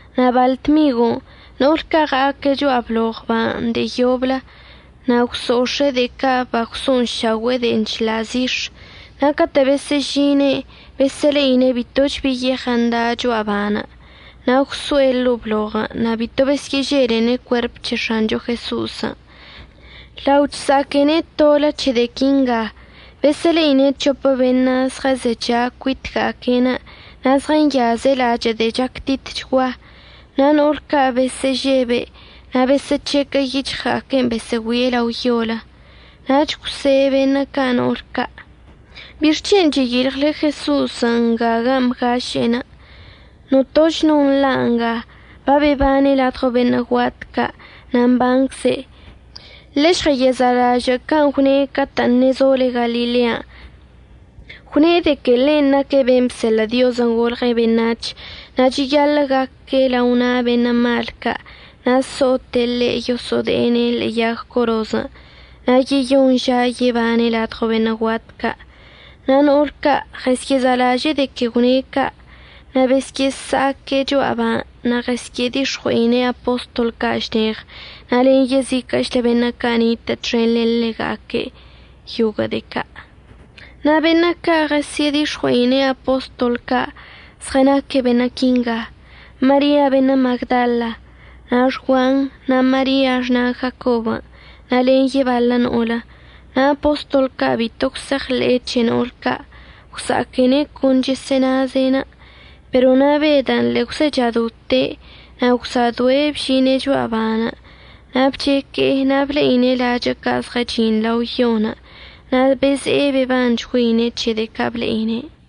Na' baḻ dmigw no'olə ca' ɉa'aque' cho'a bloɉ ban' de'e yoblə na' gwso'ox̱e'e de'e ca' bagwso'onšaogüe'e de'e chḻa' zix̱. Na' catə' besə'əžine'enə' besə'əle'ine' bitoch bi yeɉən' da' cho'a ban'. Na' gwso'e ḻo'o bloɉən' na' bito besyə'əželene' cuerp c̱he X̱ancho Jeso'osən'. Lao chsa'aquene' tolə c̱he de'e quinga, besə'əle'ine' c̱hopə beṉə' zɉəzecha cuitga'aque'enə' na' zɉənyaze' lachə' de'e chactitchgua. Na' no'ol ca' besə'əžebe' na' besə'əc̱hequə' yic̱hɉga'aque'enə' besə'əgüie' lao yolə. Nach gwse' beṉə' ca' no'ol ca': ―¿Bixc̱hen' cheyilɉle Jeso'osən' nga gan' bgaše'e? Notoch no nḻa' nga. Babebane' ladɉo beṉə' guat ca' na' mbancze'. Ḻežɉsa'alažə' can' gwne' catə' ṉezole Galilean'. Gwne' de que ḻe' naque' ben' bseḻə' Diozən' golɉe' beṉac̱h na' cheyaḻə' gaque' lao na' beṉə' mal ca' na' so'ote' ḻe' yoso'ode'ene' ḻe'e yag corozən', na' yeyoṉ ža yebane' ladɉo beṉə' guat ca'. Na' no'ol ca' ɉəsye'ezalaže'e de que gwne' ca'. Na' besyə'əsa'aque' cho'a ban' na' ɉəsyə'ədix̱ɉue'ine' apostol ca' šneɉ na' len yeziquə'əchlə beṉə' ca' nitə' txen len ḻega'aque' yoguə' de'e ca'. Na' beṉə' ca' ɉəsyə'ədix̱ɉue'ine' apostol ca' zɉənaque' beṉə' quinga: Maria beṉə' Magdala, na' Xguan, na' Maria xna' Jacob, na' len yebaḻə no'olə. Na' apostol ca' bito gwse'eɉḻe'e c̱he no'ol ca', gwsa'aquene' con chesə'ənaze'enə'. Pero na' Bedən' ḻe'e gwzechadote' na' gwsa'adoe' bžine' cho'a ban' na' bcheque'e na' ble'ine' lachə' ca' zɉəchi'in lao yon', na' beze'e bebanchgüeine' c̱he de'e ca' ble'ine'.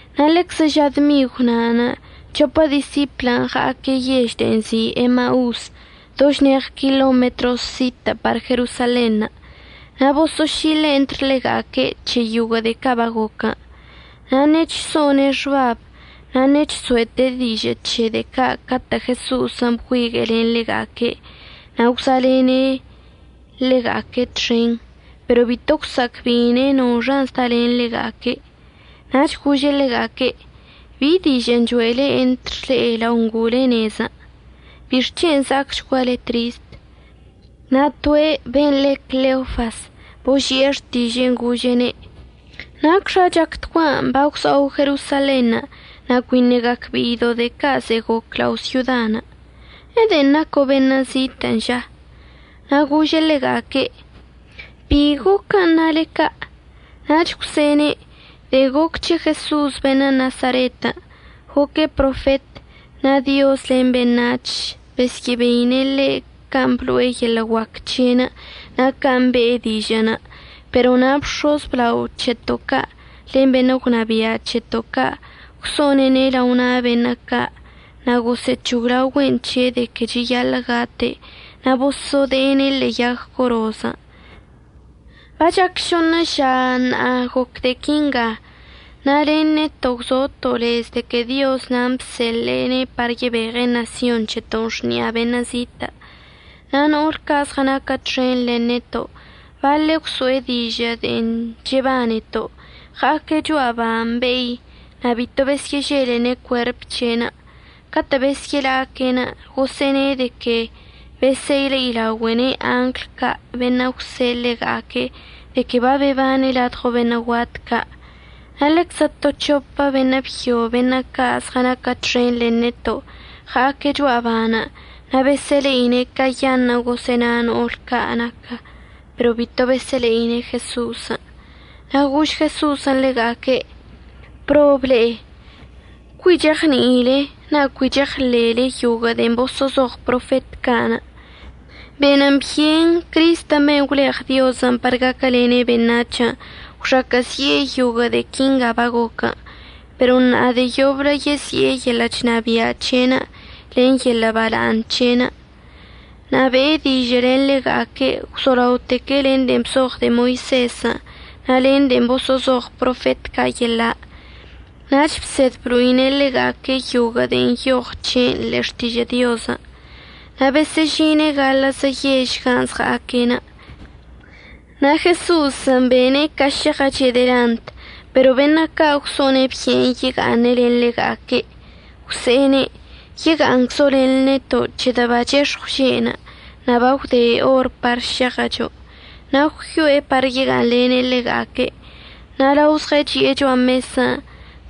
Na' ḻeczə ža dmigw na'anə' c̱hopə disiplən' ɉa'aque' yež de'e nzi' Emaus, do šneɉ kilometros zitə' par Jerosalenṉə'. Na' boso'ošile' entr ḻega'aque' c̱he yoguə' de'e ca' bagoquən'. Na' ṉechso'one' xbab na' ṉechso'ete' dižə' c̱he de'e ca' catə' Jeso'osən' bgüigue'e len ḻega'aque' na' gwza'alene' ḻega'aque' txen. Pero bito gwsa'acbe'ine' noxan' zdalen ḻega'aque'. Nach gože' ḻega'aque': ―¿Bi dižə'ən cho'ele entr le'e lao ngo'ole nezən'? ¿Bixc̱hen' za'acchguale trist? Na' toe' ben' le' Cleofas boži'e xtiže'en gože'ene': ―¿Nacxa chactguan' bagwza'o Jerosalenṉə' na' cuiṉə' gacbe'ido' de'e ca' ze'e goc lao syodan'? ¿Ede'en naco' beṉə' zitə' ža? Na' gože' ḻega'aque': ―¿Bi goquən' nale ca'? Nach gwse'ene': ―De'en goc c̱he Jeso'os beṉə' Nasaret. Goque' profet, na' Diozən' len beṉac̱hən' besyə'əbeine' ḻe' can' blo'e yeḻə' guac c̱he'enə' na' can' be'e dižə'ənə'. Pero na' bx̱oz əblao c̱heto' ca' len beṉə' gwnabia' c̱heto' ca' gwso'one'ene' lao na' beṉə' ca' na' gosə'əc̱hoglaogüe'en c̱he' de que cheyaḻə' gate', na' boso'ode'ene' ḻe'e yag corozən'. Bachac šoṉə ža ṉa'a goc de'e quinga. Na' len neto' gwzoto' lez de que Dioz nan' bseḻe'ene' par yebeɉe' ṉasyon c̱heto'onə' xni'a beṉə' zitə'. Na' no'ol ca' zɉənaquə txen len neto' baḻe' gwso'e dižə' de'en chebaneto'. Ɉa'aque' cho'a ban' be'i, na' bito besyə'əželene' cuerp c̱he'enə'. Catə' besyə'əla'aque' gosə'əne' de que besə'əle'idaogüe'ene' angl ca' beṉə' gwse'e ḻega'aque' de que babebane' ladɉo beṉə' guat ca'. Na' ḻeczə to c̱hopə beṉə' byo beṉə' ca' zɉənaquə txen len neto' ɉa'aque' cho'a ban' na' besə'əle'ine' cayaṉə'ən gosə'əna no'ol ca' naquə, pero bito besə'əle'ine' Jeso'osən'. Na' gož Jeso'osən' ḻega'aque': ―¡Prob le'e! Cui cheɉni'ile na' cui cheɉḻe'ele yoguə' de'en boso'ozoɉ profet ca'. Benən byen Crist ben' gwleɉ Diozən' par gaquəlene' beṉac̱hən' gwxaquə'əzi'e yoguə' de'e quinga bagoc, pero na' de'e yoblə yezi'e yeḻə' chnabia' c̱he'enə' len yeḻə' bala'aṉ c̱he'enə'. Na' be'e dižə' len ḻega'aque' gwzolaoteque' len de'en bzoɉ de'e Moisezən' na' len de'en boso'ozoɉ profet ca' yeḻa', nach bsed blo'ine' ḻega'aque' yoguə' de'en nyoɉ c̱he'enə' ḻe'e Xtižə' Diozən'. Na' besə'əžine' gaḻə'əzə yežən' gan' zɉa'aque'. Na' Jeso'osən' bene' ca šeɉəche' delant. Pero beṉə' ca' gwso'one' byen yega'aṉe' len ḻega'aque', gwse'ene': ―Yega'aṉczo' len neto' c̱hedə' bachex̱ɉw že'enə' na' bagwde or par šeɉəcho'. Na' gwyo'e par yega'aṉlene' ḻega'aque'. Na' lao zɉəchi'e cho'a mesən'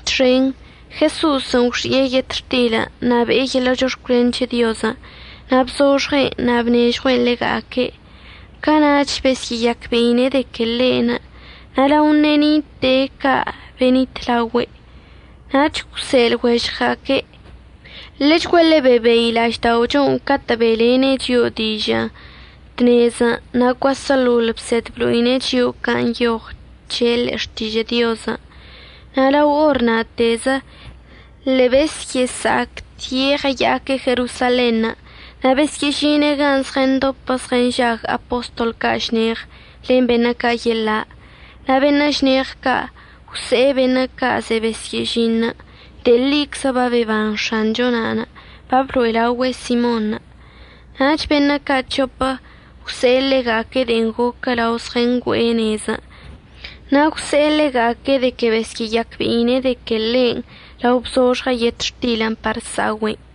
txen, Jeso'osən' gwxi'e yetxtilən' na' be'e yeḻə' chox̱cwlen c̱he Diozən', na' bzoxɉe'en na' bnežɉue'en ḻega'aque'. Cana'ach besyə'əyacbe'ine' de que ḻe'enə', na' lao ṉe'e nite'e ca' benitlaogüe'. Nach gwse'e lɉuežɉga'aque': ―Ḻechguaḻe bebei la'ažda'ochon' catə' be'elene' chio'o dižə' tnezən' na' cuaseḻoḻ bsed blo'ine' chio'o can' nyoɉən c̱he' ḻe'e Xtižə' Diozən'. Na' lao or na'atezə ḻe'e besyə'əsa'acte' ɉəya'aque' Jerosalenṉə', na' besyə'əžine' gan' zɉəndopə zɉənžag apostol ca' šneɉ len beṉə' ca' yeḻa'. Na' beṉə' šneɉ ca' gwse'e beṉə' ca' ze'e besyə'əžin: ―De'e ḻiczə babeban X̱anchon'. Bablo'elaogüe' Simonṉə'. Nach beṉə' ca' c̱hopə gwse'e ḻega'aque' de'en goquə lao zɉəngüe'e nezən', na' gwse'e ḻega'aque' de que besyə'əyacbe'ine' de que ḻe'enə' lao bzoxɉe' yetxtilən' par sa'ogüe'en.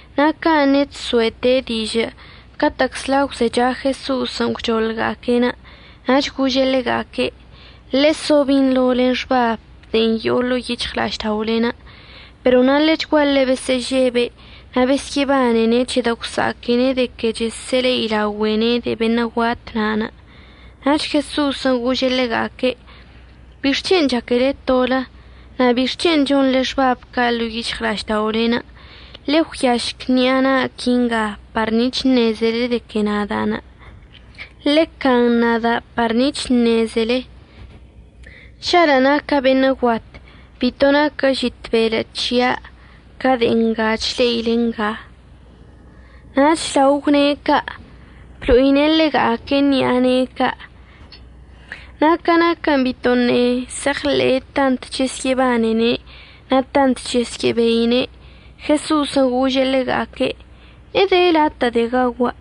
Na' ca ṉe'e chso'ete' dižə' catə'əczla gwzecha Jeso'osən' gwchoḻga'aque'enə' nach gože' ḻega'aque': ―Ḻeso binḻo len xbab de'en yo'o ḻo'o yic̱hɉla'ažda'olen'. Pero na' ḻechguaḻe besə'əžebe' na' besyə'əbanene' c̱hedə' gwsa'aquene' de que chesə'əle'ida'ogüe'ene' de'e beṉə' guat na'anə'. Nach Jeso'osən' gože' ḻega'aque': ―¿Bixc̱hen' chaquele tolə? na' ¿bixc̱hen' chonḻe xbabən' ca' ḻo'o yic̱hɉla'ažda'olen'? Ḻe'e ggüiašc ṉi'a na'a quinga par nic̱h əṉezele de que nada'anə'. Ḻe'e can nada' par nic̱h əṉezele. Žalə' naca' beṉə' guat bito naquə žit belə' c̱hia' ca de'e nga chle'ile nga. Nach lao gwne' ca', blo'ine' ḻega'aque' ṉi'a ne'e ca'. Na' ca naquə bitoṉə' se'eɉḻe'e tant chesyə'əbanene' na' tant chesyə'əbeine', Jeso'osən' gože' ḻega'aque': ―¿Ede latə' de'e gaogua'?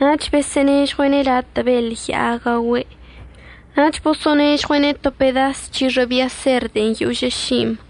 Nach bosə'ənežɉue'ene' latə' beḻ ya'a gaogüe', nach bosə'ənežɉue'ene' to pedas c̱hixə' bia ser de'en yožə ši'imb.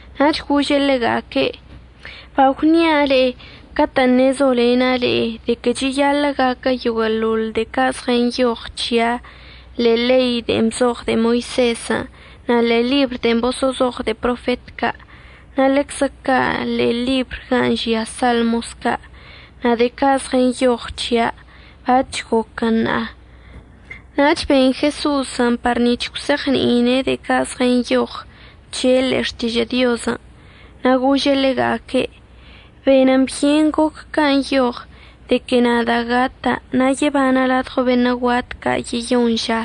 Nach gože' ḻega'aque': ―Bagwni'a le'e catə'ən ṉezolena' le'e de que cheyaḻə' gaquə yoguə'əḻoḻ de'e ca' zɉənyoɉ c̱hia' ḻe'e ḻei de'en bzoɉ de'e Moisezən', na' ḻe'e ḻibr de'en boso'ozoɉ de'e profet ca', na' ḻeczə ca' ḻe'e ḻibr gan' žia Salmos ca'. Na' de'e ca' zɉənyoɉ c̱hia' bac̱h goquən ṉa'a. Nach ben Jeso'osən' par nic̱h gwse'eɉni'ine' de'e ca' zɉənyoɉən c̱he' ḻe'e Xtižə' Diozən'. Na' gože' ḻega'aque': ―Benən byen goc can' nyoɉən de que nada' gata' na' yebana' ladɉo beṉə' guat ca' yeyoṉ ža,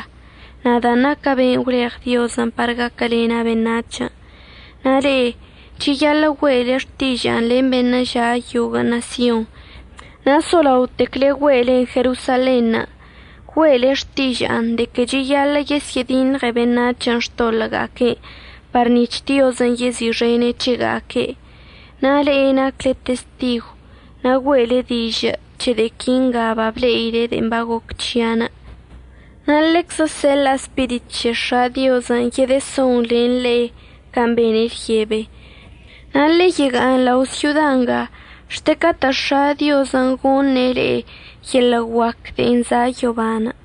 nadan' naca' ben' gwleɉ Diozən' par gaquəlena' beṉac̱hən'. Na' le'e cheyaḻə' güe'ele xtiža'anə' len beṉə' ža' yoguə' ṉasyon, na' solaotecle güe'elen Jerosalenṉə'. Güe'ele xtiža'anə' de que cheyaḻə' yesyə'ədiṉɉe beṉac̱hən' xtoḻə'əga'aque'enə' par nic̱h Diozən' yezi'ixene' c̱hega'aque'. Na' le'e nacle testigw na' güe'ele dižə' c̱he de'e quinga bable'ile de'en bagoc c̱hia'. Na' ḻeczə əseḻa'a Spirit c̱he X̱a' Diozən' yedəson len le'e can' bene' lyebe. Na' ḻe'e yega'aṉ lao' syoda nga xte catə' X̱a' Diozən' goṉe' le'e yeḻə' guac de'en za' yoban'.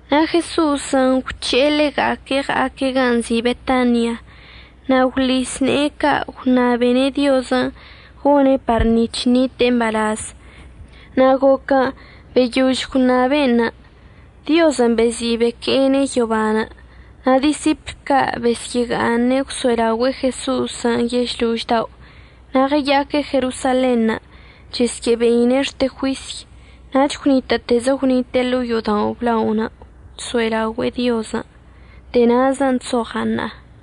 Na' Jeso'osən' gwc̱he'e ḻega'aque' ɉa'aque' gan' nzi' Betania, na' gwḻis ne'e ca' gwṉabene' Diozən' gone' par nic̱h ṉite'e mbalaz. Na' goquən' beyož gwṉabe'en, Diozən' bezi' beque'ene' yobanə'. Na' disipl ca' besyə'əga'aṉe' gwso'elaogüe'e Jeso'osən' yešlož dao' na' ɉəya'aque' Jerosalenṉə' chesyə'əbeine' xte juisy. Nach gwnitə'ətezə gwnite'e ḻo'o yo'odao' əblaonə' chso'elaogüe'e Diozən'. De'e na'azən' chzoɉa' ṉa'a.